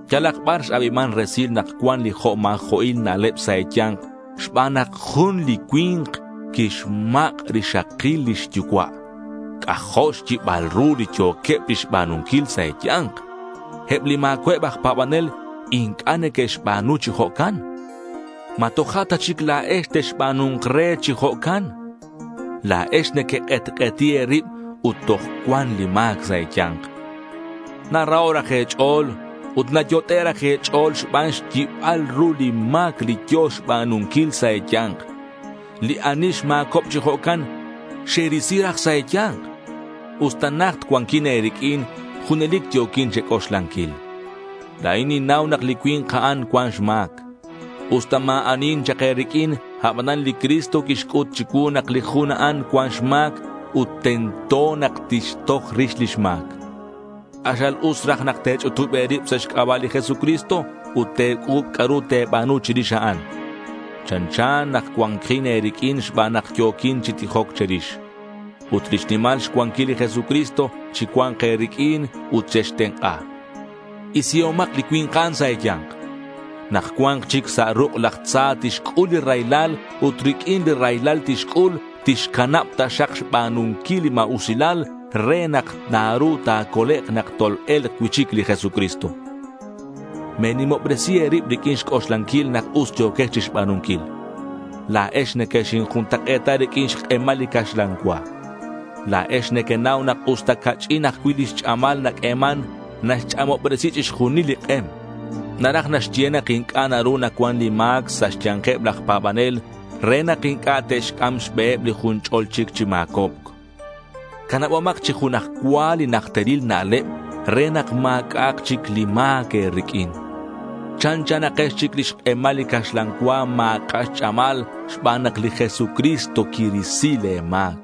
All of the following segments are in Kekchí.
Yalak bar x-abiman resil nak cuan li jo' ma̱jo'il na'leb sa' e̱ya̱nk xban nak jun li cui̱nk quixmak' rixakil lix yucua'. C'ajo' xyibal ru li yo̱queb chixba̱nunquil sa' e̱ya̱nk. Eb li ma̱cua'eb aj pa̱banel inc'a' neque'xba̱nu chi jo'can. ¿Ma toja' ta chic la̱ex texba̱nu̱nk re chi jo'can? La̱ex nequek'etk'eti e̱rib ut toj cuan li ma̱c sa' e̱ya̱nk. Naraho' raj e̱ch'o̱l ut nayot'e' raj e̱ch'o̱l xban xyibal ru li ma̱c li yo̱ xba̱nunquil sa' e̱ya̱nk. Li ani xma̱cob chi jo'can xerisi raj sa' e̱ya̱nk. Usta najt cuanquin e̱riq'uin junelic yo̱quin che̱c'oxlanquil. La̱in ninnau nak li cui̱nk a'an cuan xma̱c. Usta ma̱ anihin chak e̱riq'uin, abanan li Cristo quixc'ut chicuu nak li jun a'an cuan xma̱c ut tento nak tixtoj rix lix ma̱c. K'axal us raj nak te̱ch'utub e̱rib sa' xc'aba' li Jesucristo ut te̱c'u̱b c'a'ru te̱ba̱nu chirix a'an. Chanchan nak cua̱nkin e̱riq'uin xban nak yo̱quin chi tijoc che̱rix. Ut lix nimal xcuanquil li Jesucristo chicua̱nk e̱riq'uin ut chextenk'a. Isihomak li cui̱nk a'an sa' e̱ya̱nk. Nak cua̱nk chic sa' ruk' laj tza tixc'ul li raylal ut riq'uin li raylal tixc'ul, tixcanab taxak xba̱nunquil li ma̱usilal re nak naru ta̱colek' nak tol-e̱lk cui'chic li Jesucristo. Me̱nimobresi e̱rib riq'uin xc'oxlanquil nak us yo̱quex chixba̱nunquil. La̱ex nequexinjuntak'e̱ta riq'uin xk'emal li caxlan cua. La̱ex nequenau nak usta ca'ch'in ajcui' lix ch'amal naq'ueman, naxch'amobresi chixjunil li k'em. Naraj naxye nak inc'a' naru nacuan li ma̱c sa' xya̱nkeb laj pa̱banel re nak inc'a' te'xc'am xbeheb li jun ch'o̱l chic chi ma̱cobc. Canabomak chi junaj cua li najteril na'leb re nak ma̱c'a'ak chic li ma̱c e̱riq'uin. Chanchanakex chic lix k'emal li caxlan cua ma̱c'a' xch'amal xban nak li Jesucristo quirisi le̱ ma̱c.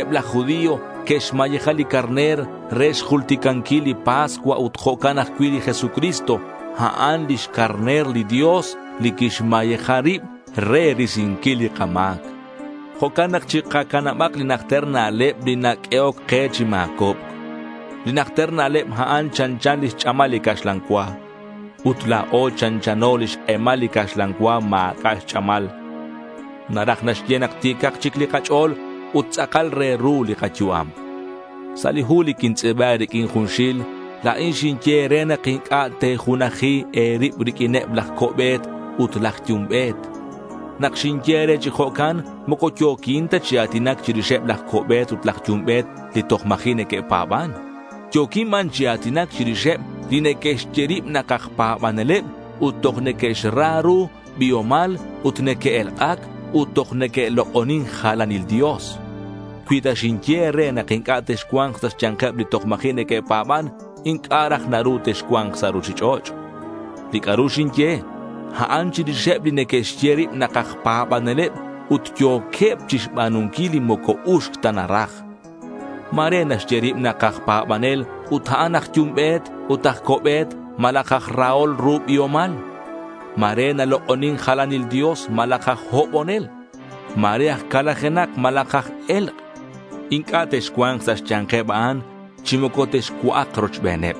Eb laj judío que'xmayeja li carner re xjulticanquil li pascua ut jo'can ajcui' li Jesucristo a'an lix carner li Dios li quixmayeja rib re risinquil li kama̱c. Jo'can nak chikacanabak li najter na'leb li naq'uehoc ke chi ma̱cobc. Li najter na'leb a'an chanchan lix ch'amal li caxlan cua. Ut la̱o chanchanako li xk'emal li caxlan cua ma̱c'a' xch'amal. Naraj naxye nak ti̱cak chic li kach'o̱l ut tz'akal re ru li kayu'am. Sa' li hu li quintz'i̱ba e̱riq'uin junxil, la̱in xinye e̱re nak inc'a' te̱junaji e̱rib riq'uineb laj co'be̱t ut laj yumbe̱t. Nak xinye e̱re chi jo'can moco yo̱quin ta chi a̱tinac chirixeb laj co'be̱t ut laj yumbe̱t li toj ma̱ji' neque'pa̱ban. Yo̱quin ban chi a̱tinac chirixeb li neque'xye rib nak aj pa̱baneleb ut toj neque'xra ru biomal ut neque'elk'ac ut toj neque'lok'onin jalanil dios. Cui ta xinye e̱re nak inc'a' texcua̱nk sa' xya̱nkeb li toj ma̱ji' neque'pa̱ban, inc'a' raj naru texcua̱nk sa' ruchich'och'. Li c'a'ru xinye, a'an chirixeb li neque'xye rib nak aj pa̱baneleb ut yo̱queb chixba̱nunquil li moco uxc ta naraj. Ma̱re naxye rib nak aj pa̱banel ut a'an aj yumbe̱t ut aj co'be̱t malaj aj rahol ru biomal. Ma̱re nalok'onin jalanil dios, malaj aj hobonel. Ma̱re aj calajenak malaj aj e̱lk'. Inc'a' texcua̱nk sa' xya̱nkeb a'an chi moco texcua'ak rochbeneb.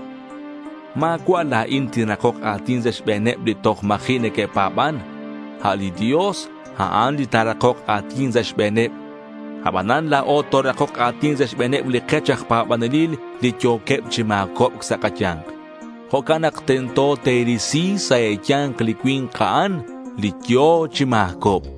Ma̱cua' la̱in tinrakok a̱tin sa' xbe̱neb li toj ma̱ji' neque'pa̱ban. A' li Dios, a'an li ta̱rakok a̱tin sa' xbe̱neb. Abanan la̱o torakok a̱tin sa' xbe̱neb li kech aj pa̱banelil li yo̱queb chi ma̱cobc sa' kaya̱nk. Jo'can nak tento te̱risi sa' e̱ya̱nk li cui̱nk a'an li yo̱ chi ma̱cobc.